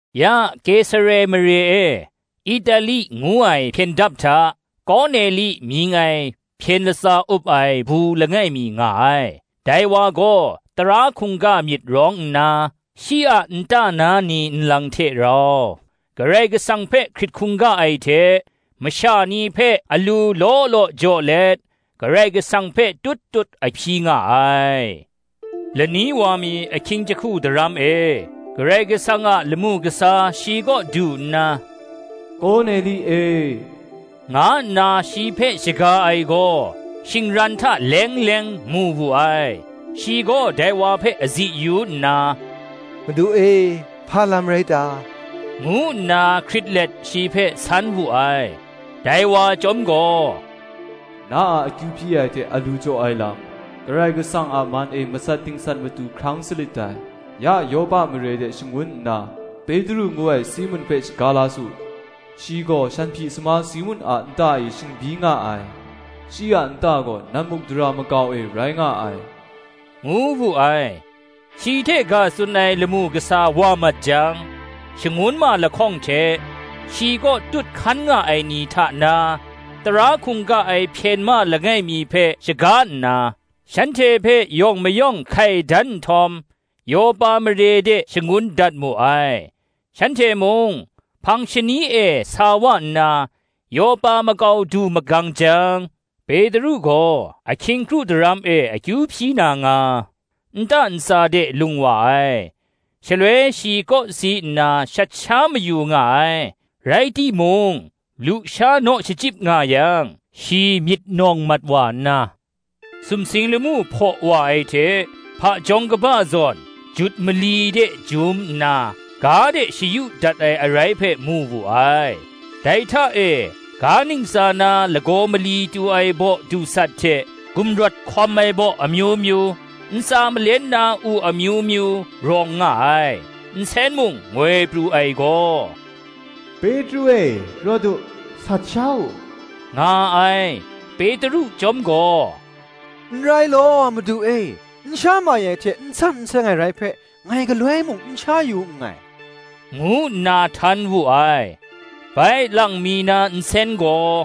Ya Kesare mare e, Itali ngu ai hpyen dap hta, Korneli mying ai hpyen latsa up ai bu langai mi nga ai: dai wa gaw tara hkungga myit rawng nna, shi a nta na ni nlang hte rau Karai Kasang hpe hkrit hkungga ai hte, masha ni hpe alu law law jaw let, Karai kasang hpe tut tut a hpyi nga ai. Lani wa mi ahkying jahku daram e, Karai Kasang a lamu kasa shi kaw du nna, “Korneli e,” nga nna shi hpe shaga ai gaw, shingran hta leng leng mu wu ai. Shi gaw dai wa hpe azi yu nna, “Madu e, hpa lam rai ta?” ngu nna hkrit let shi hpe san wu ai. Dai wa chyawm gaw, “Na a akyu hpyi ai hte alu jaw ai lam, Karai Kasang a man e, masat dingsat matu hkrang salit dai. Ya Yopa mare de shangun nna, Petru ngu ai Simun hpe shaga la su; shi gaw shanhpyi sama Simun a nta e shingbyi nga ai; shi a nta gaw nammukdara makau e rai nga ai,” ngu wu ai. Shi hte ga tsun ai lamu kasa wa mat jang, shangun ma lahkawng hte, shi kaw tut hkan nga ai ni hta na, tara hkungga ai hpyen ma langai mi hpe shaga nna, shanhte hpe yawng mayawng hkai dan nhtawm, Yopa mare de shangun dat mu ai. Shanhte mung hpang shani e sa wa nna, Yopa makau du magang jang, Petru gaw ahkying kru daram e akyu hpyi na nga, nta ntsa de lung wa ai. Shaloi shi kawsi nna shat sha mayu nga ai: rai timung, lusha naw shachyip nga yang, shi myit nawng mat wa nna, sumsing lamu hpaw wa ai hte, hpajawng kaba zawn, jut mali de jum nna, ga de shayu dat ai arai hpe mu wu ai: dai hta e, ga ntsa na lagaw mali tu ai baw dusat hte gumrawt hkawm ai baw amyu myu, ntsa malen na u amyu myu, rawng nga ai. Nsen mung ngoi pru ai gaw, “Petru e, rawt u, sat sha u,” nga ai. Petru chyawm gaw, “N rai law, Madu e; n sha mai ai hte n san n seng ai rai hpe, ngai galoi mung n sha yu nngai,” ngu nna htan wu ai. Bai lang mi na nsen gaw,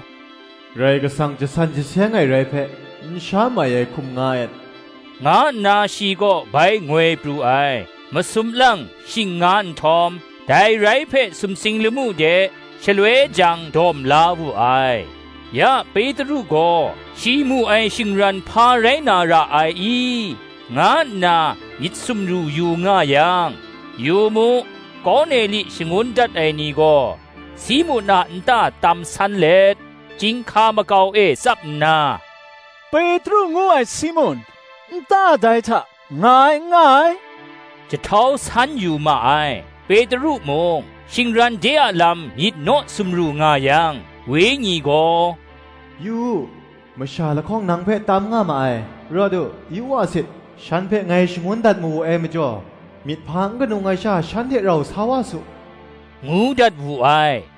“Karai Kasang jasan jaseng ai rai hpe, n sha mai ai hkum nga et,” nga nna shi kaw bai ngoi pru ai. Masum lang shing nga nhtawm, dai rai hpe sumsing lamu de, shaloi jang dawm la wu ai. Ya Petru gaw, shi mu ai shingran hpa rai na ra ai i? nga nna myit sumru yu nga yang, yu mu, Korneli shangun dat ai ni gaw, Simun a nta tam san let, chyinghka makau e tsap nna, Petru ngu ai Simun, nta dai hta nga ai n nga ai, jahtau san yu ma ai. Petru mung, shingran de a lam myit naw sumru nga yang, Wenyi gaw, “Yu u, masha lahkawng nang hpe tam nga ma ai: rawt u, yu wa sit; shan hpe ngai shangun dat mawe ai majaw, myit hpa n ganung ai sha, shan hte rau sa wa su,” ngu dat wu ai.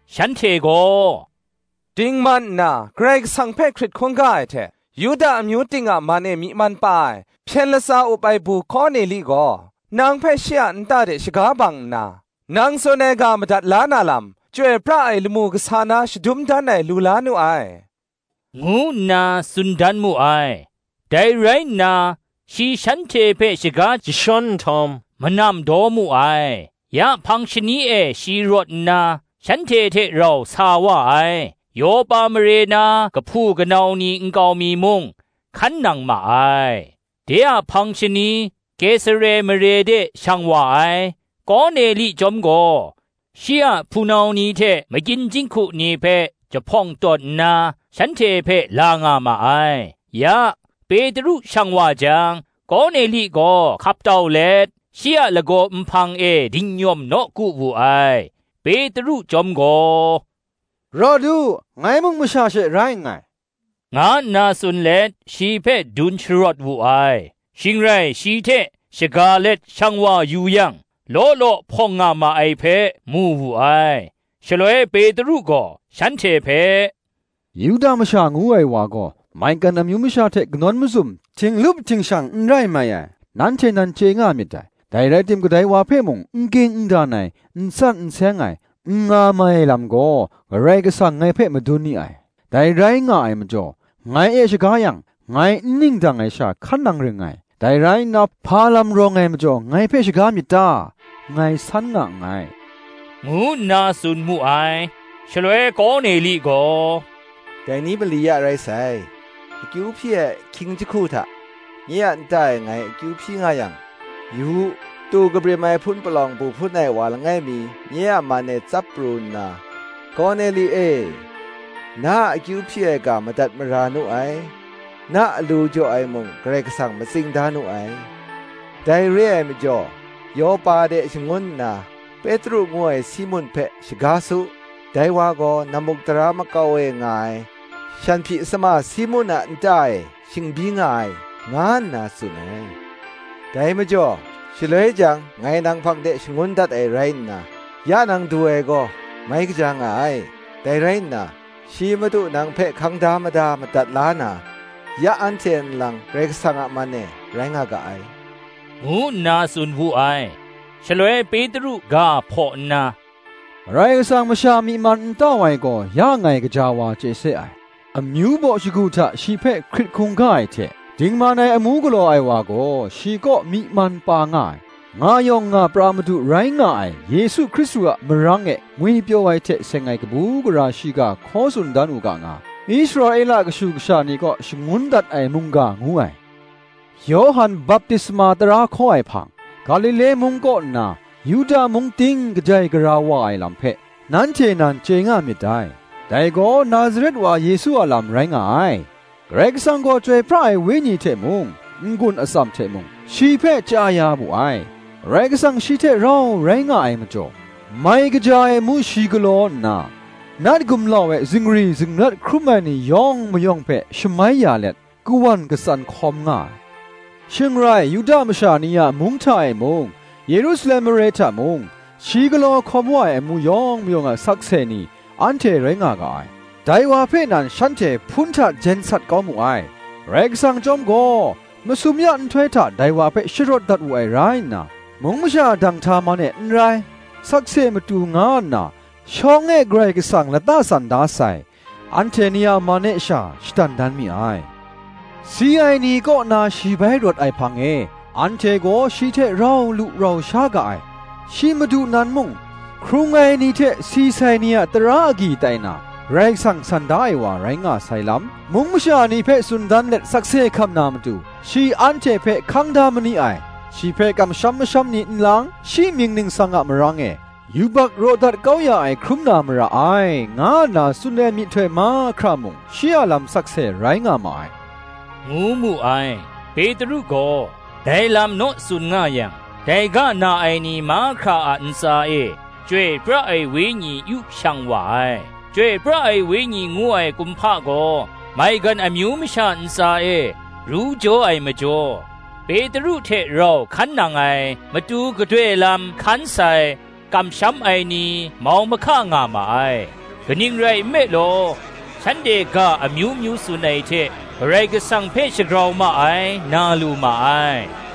Shanhte gaw, “Dingman nna, Karai Kasang hpe hkrit hkungga ai hte, Yuda amyu ting a man e myi man pa ai, hpyen latsa up ai bu Korneli gaw, nang hpe shi a nta de shaga bang nna, nang tsun ai ga madat la na lam, chyoi pra ai lamu kasa nan shadum dan ai lu la nu ai,” ngu nna tsun dan mu ai. Dai rai nna, shi shanhte hpe shaga jashawn nhtawm, manam daw mu ai. Ya hpang shani e shi rawt nna, shanhte hte rau sa wa ai; Yopa mare na kahpu kanau ni nkau mi mung hkan nang ma ai. De a hpang shani Kesare mare de shang wa ai; Korneli chyawm gaw, shi a hpunau ni hte makyin jinghku ni hpe jahpawng tawn nna, shanhte hpe la nga ma ai. Ya, Petru shang wa jang, Korneli gaw hkap tau let, shi a lagaw nhpang e dingnyawm nawku wu ai. Petru chyawm gaw, “Rawt u, ngai mung masha she rai nngai,” nga nna tsun let shi hpe dun sharawt wu ai. Shing rai shi hte shaga let shang wa yu yang, law law hpawng nga ma ai hpe, mu wu ai. Shaloi Petru gaw shanhte hpe, “Yuda masha ngu ai wa gaw maigan amyu masha hte kanawn mazum, htinglup htingshang n rai mai ai, nanhte nan chye nga myit dai: dai rai tim kadai wa hpe mung n ging n dan ai, n san n seng ai, n nga mai ai lam gaw, Karai Kasang ngai hpe madun ni ai. Dai rai nga ai majaw, ngai e shaga yang, ngai n ningdang ai sha hkan nang ring ngai. Dai rai nna, hpa lam rawng ai majaw ngai hpe shaga myit ta? ngai san nga nngai,” ngu nna tsun mu ai. Shaloi Korneli gaw, “Dai ni mali ya rai sai, akyu hpyi ai ahkying jahku hta, nye a nta e ngai akyu hpyi nga yang, yu u, tu kabrim ai hpun palawng bu hpun ai wa langai mi nye a man e tsap pru nna, ‘Korneli e, na a akyu hpyi ai ga madat mara nu ai; na alu jaw ai mung Karai Kasang matsing da nu ai. Dai re ai majaw Yopa de shangun nna, Petru ngu ai Simun hpe shaga su; dai wa gaw, nammukdara makau e nga ai shanhpyi sama Simun a nta e shingbyi nga ai,’ nga nna tsun ai. Dai majaw, shaloi jang ngai nang hpang de shangun dat ai rai nna, ya nang du ai gaw, mai kaja nga ai. Dai rai nna, shi Madu nang hpe hkang da mada madat la na, ya anhte nlang Karai Kasang a man e, rai nga ga ai,” ngu nna tsun wu ai. Shaloi Petru ga hpaw nna, “Karai Kasang masha myi man n tau ai gaw, ya ngai gaja wa chye se ai: amyu baw shagu hta shi hpe hkrit hkungga ai hte dingman ai amu galaw ai wa gaw, shi kaw myi man pa nga ai. Nga yawng nga pra Madu rai nga ai Yesu Hkristu a marang e ngwipyaw ai hte seng ai kabu gara shiga hkaw tsun dan u ga nga, Israela kashu kasha ni kaw shangun dat ai mungga ngu ai: Yawhan baptisma tara hkaw ai hpang, Galile mung kaw nna Yuda mung ting kajai gara wa ai lam hpe, nanhte nan chye nga myit dai: dai gaw Nazaret wa Yesu a lam rai nga ai; Karai Kasang gaw Chyoi pra ai Wenyi hte mung, n-gun atsam hte mung, shi hpe chya ya wu ai; Karai Kasang shi hte rau rai nga ai majaw, mai kaja ai amu shi galaw nna, nat gumlau e zingri zingrat hkrum ai ni yawng mayawng hpe shamai ya let, kawan katsan hkawm nga ai. Shing rai, Yuda masha ni a mung hta e mung, Yerusalem mare hta mung, shi galaw hkawm wa ai amu yawng mayawng a sakse ni, anhte rai nga ga ai: dai wa hpe nan shanhte hpun hta jen sat kau mu ai. Karai Kasang chyawm gaw, masum ya nhtoi hta dai wa hpe sharawt dat wu ai rai nna, mung masha danghta man e n rai, sakse matu nga nna, shawng e Karai Kasang lata san da sai anhte ni a man e sha shadan dan mi ai: si ai ni kaw na shi bai rawt ai hpang e, anhte gaw shi hte rau lu sha lu ga ai. Shi Madu nan mung, hkrung ai ni hte si sai ni a tara agyi tai na, Karai Kasang san da ai wa rai nga sai lam, mung masha ni hpe tsun dan let sakse hkam na matu shi anhte hpe hkang da ma ni ai. Shi hpe kamsham masham ni nlang, shi mying ningsang a marang e, yubak raw dat kau ya ai hkrum na mara ai, nga nna tsun ai myihtoi mahkra mung shi a lam sakse rai nga ma ai,” ngu mu ai. Petru gaw dai lam naw tsun nga yang, dai ga na ai ni mahkra a ntsa e Chyoi pra ai Wenyi yu shang wa ai. Chyoi pra ai Wenyi ngu ai kumhpa gaw, maigan amyu masha ntsa e ru jaw ai majaw, Petru hte rau hkan nang ai, matu gadoi lam hkan sai, kamsham ai ni, mau mahka nga ma ai: kaning rai nme law, shanhte ga amyu myu tsun ai hte Karai Kasang hpe shagrau ma ai, na lu ma ai.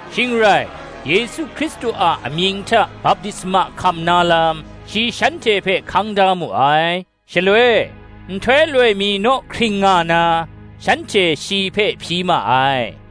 Shing rai, Yesu Hkristu a amying hta baptisma hkam na lam, shi shanhte hpe hkang da mu ai. Shaloi, nhtoi loi mi naw hkring nga na, shanhte shi hpe hpyi ma ai.